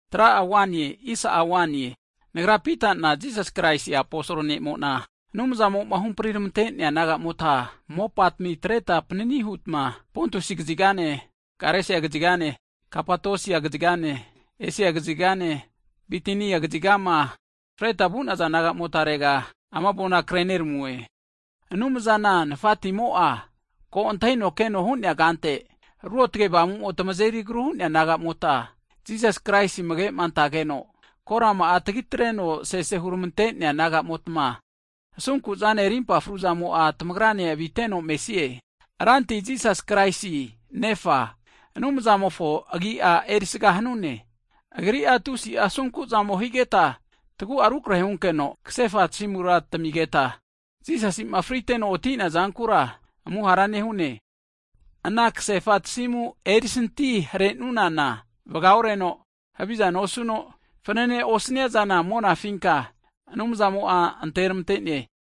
Hagi nagra Pita'na Jisas Kraisi aposol ne'mo'na, Anumzamo'ma huhampri tamente'nea naga'motma, mopatmi atretma panini hutma Pontusi kazigane, Galesia kazigane, Kapodosia kazigane, Esia kazigane, Bitinia kazigama fretma vu'naza naga'motarega ama avona kreneramue. Anumzana Tafatimo'a, ko antahino keno hu'nea kante, Ruotge Avamumo tamazeri agru hu'nea naga'mota, Jisas Kraisi amage'ma antageno, korama'a tagitreno sese huramante'nea nagamotma, asunku'zane rimpa fruzamo'a tamagrane aviteno mesie. Hagi Ranti Jisas Kraisi Nefa Anumzamofo agi'a erisaga hanune, Agri'a tusi'a asunku'zamo higeta, tagu'a rukrehe hunkeno kasefa tasimura tamigeta, Jisasi'ma friteno oti'nea zankura amuhara nehune. Ana kasefa tasimu erisanti hare'nunana, vaga oreno, havizana osuno, fananene osaniaza monafinka Anumzamo'a anteramante'ne.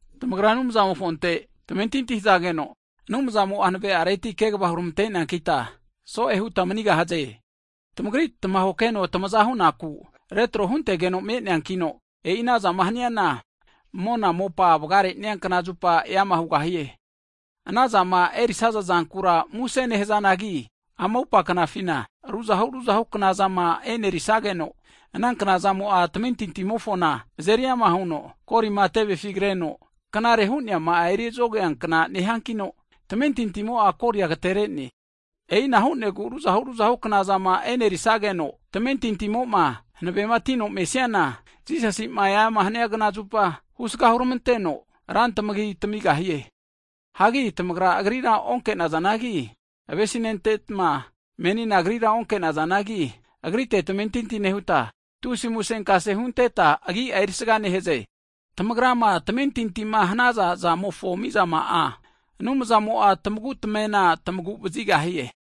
Tamagra Anumzamofonte tamentinti hazageno, Anumzamo'a hanave'areti kegava huramante'neankita, so'e hutma manigahaze. Tamagri tamahokeno tamaza hunaku retro huntegeno me'neankino, e'i anazama haniana mona mopa vagamare'nea knazupa eama hugahie. Anazama erisaza zankura muse nehazanagi, ama atupa knafina ruzahu ruzahu knazama e'nerisageno, ana knazamo'a tamentintimofona azeri ama huno, golima tevefi kre agru huno azeri hentofaza hiankna nehiankino, tamentintimo'a goli'a agaterene. E'ina hu'negu ruzahu ruzahu knazama e'nerisageno, tamentintimo'ma hanavematino mesiana, Jisasi'ma eama hania knazupa, husga huramanteno, ra tamagia tamigahie. Hanki tamagra Agrira onke'nazanagi avesinentetma, menina Agrira onkenazanagi, Agritera tamentinti nehuta, tusi musenkase hunteta agi'a erisaga nehaze. Tamagrama tamentintima hanaza zamofo mizama'a, Anumzamo'a tamagu tamamena tamagu vazigahie.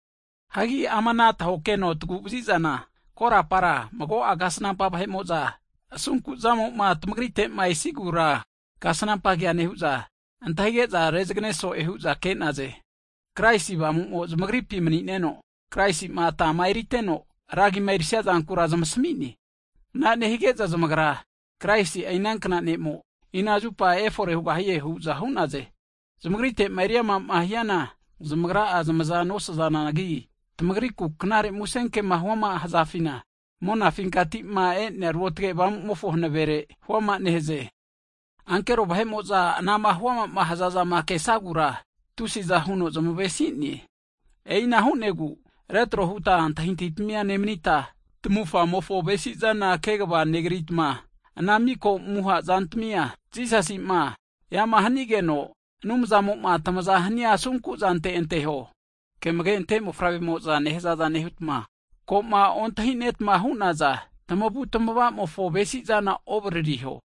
Hagi ama ana tahokeno taguvazizana, korapara mago'a kasnampa vahe'mo'za asunkuzamo'ma tamagrite'ma esigura kasnampa kea nehu'za, antahige'za rezagane so'e hu'za ke'naze. Kraisi Avamumo zamagripi mani'neno, Kraisi'ma atama eriteno, ra agima erisia zankura zmasami'ne. Ana nehige'za zamagra Kraisi'a inankna Ne'mo, ina zupa efore hugahie hu'za hu'naze. Zamagrite'ma eriamama hiana zamagra'a zamaza nosazanagi, tamagriku Knare Musenkema huama hazafina, monafinti'ma e'nea Ruotge Avamumofo hanavere huama nehaze. Ankero vahe'mo'za anama huamama hzazama kesagura, tusiza huno zmavesi'ne. E'ina hu'negu retro huta antahintahitamia nemanita, tamavufgamofo avesizana kegava negritma, ana miko amuha zantamia, Jisasi'ma eama hanigeno, Anumzamo'a tamaza hania asunkuzante anteho. Ke amage'ante mofavremo'za nehazaza nehutma, koma ontahinetma hu'naza tamavutamavamofo avesizana ovaririho.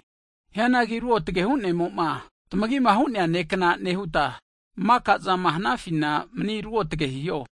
Hianagi Ruotge Hu'nemo'ma tamagima hu'nea ne'kna nehuta, maka'zama hanafina mani ruotge hiho.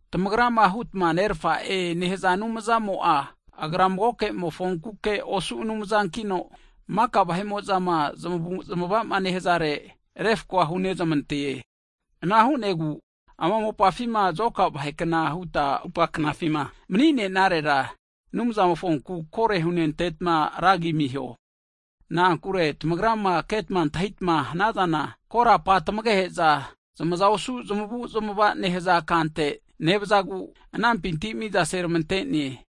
Tamagrama hutma nerafa'e nehaza Anumzamo'a, Agra magokemofonkuke osu Anumzankino, maka vahe'mo'za zamavuzmavama nehazare refkoa huzmantegahie. Ana hu'negu, ama mopafima zoka vahekna huta atupa knafima mani'nenarera, Anumzamofonku kore hunentetma ra agi amiho. Na'ankure tamagrama ketma antahitama hanazana, korapa tamagehe'za zamaza osu zamavu'zmava nehaza kante nevazagu, anampinti mizaseramante'ne.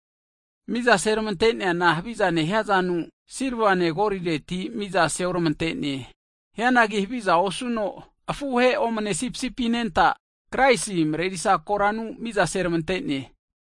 Miza seramante'neana haviza nehiazanu, silvane golireti miza seoramante'ne. Hianagi haviza osuno afuhe omne sipisipi anenta, Kraisi korana marerisa mizanteti mizana seramante'ne.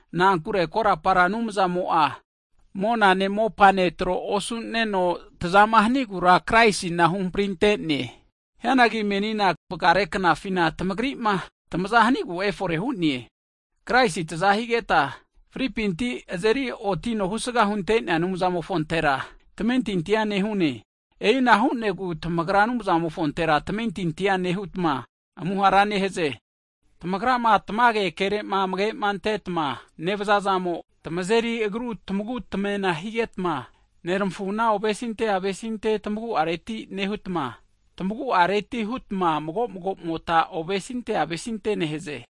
Na'ankure korapa Anumzamo'a, monane mopane tro osu'neno, tazama hanigura Kraisina huhamprinte'ne. Hianagi menina vagare knafina tamagri'ma tamaza hanigu efore hu'ne. Kraisi taza higeta, fripinti azeri otino husga hunte'nea Anumzamofontera tamentintia nehune. E'ina hu'negu tamagra Anumzamofontera tamentintia nehutma, amuhara nehaze. Tamagrama tamage kere'ma amagema antetma nevazazamo, tamazeri agru tamagu tamena higetma, neramafuma ovesinte avesinte tamagu'areti nehutma, tamaguareti hutma mago magomota ovesinte avesintea nehaze.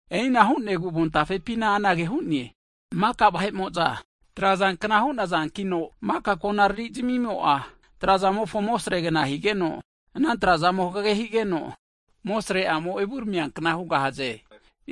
E'ina hu'negu avontafepina anage hu'ne, Maka vahe'mo'za trazankna hu'nazankino, maka konariri zamimo'a trazamofo amosregna higeno, ana trazamo hagege higeno, amosre'amo evuramiankna hugahaze.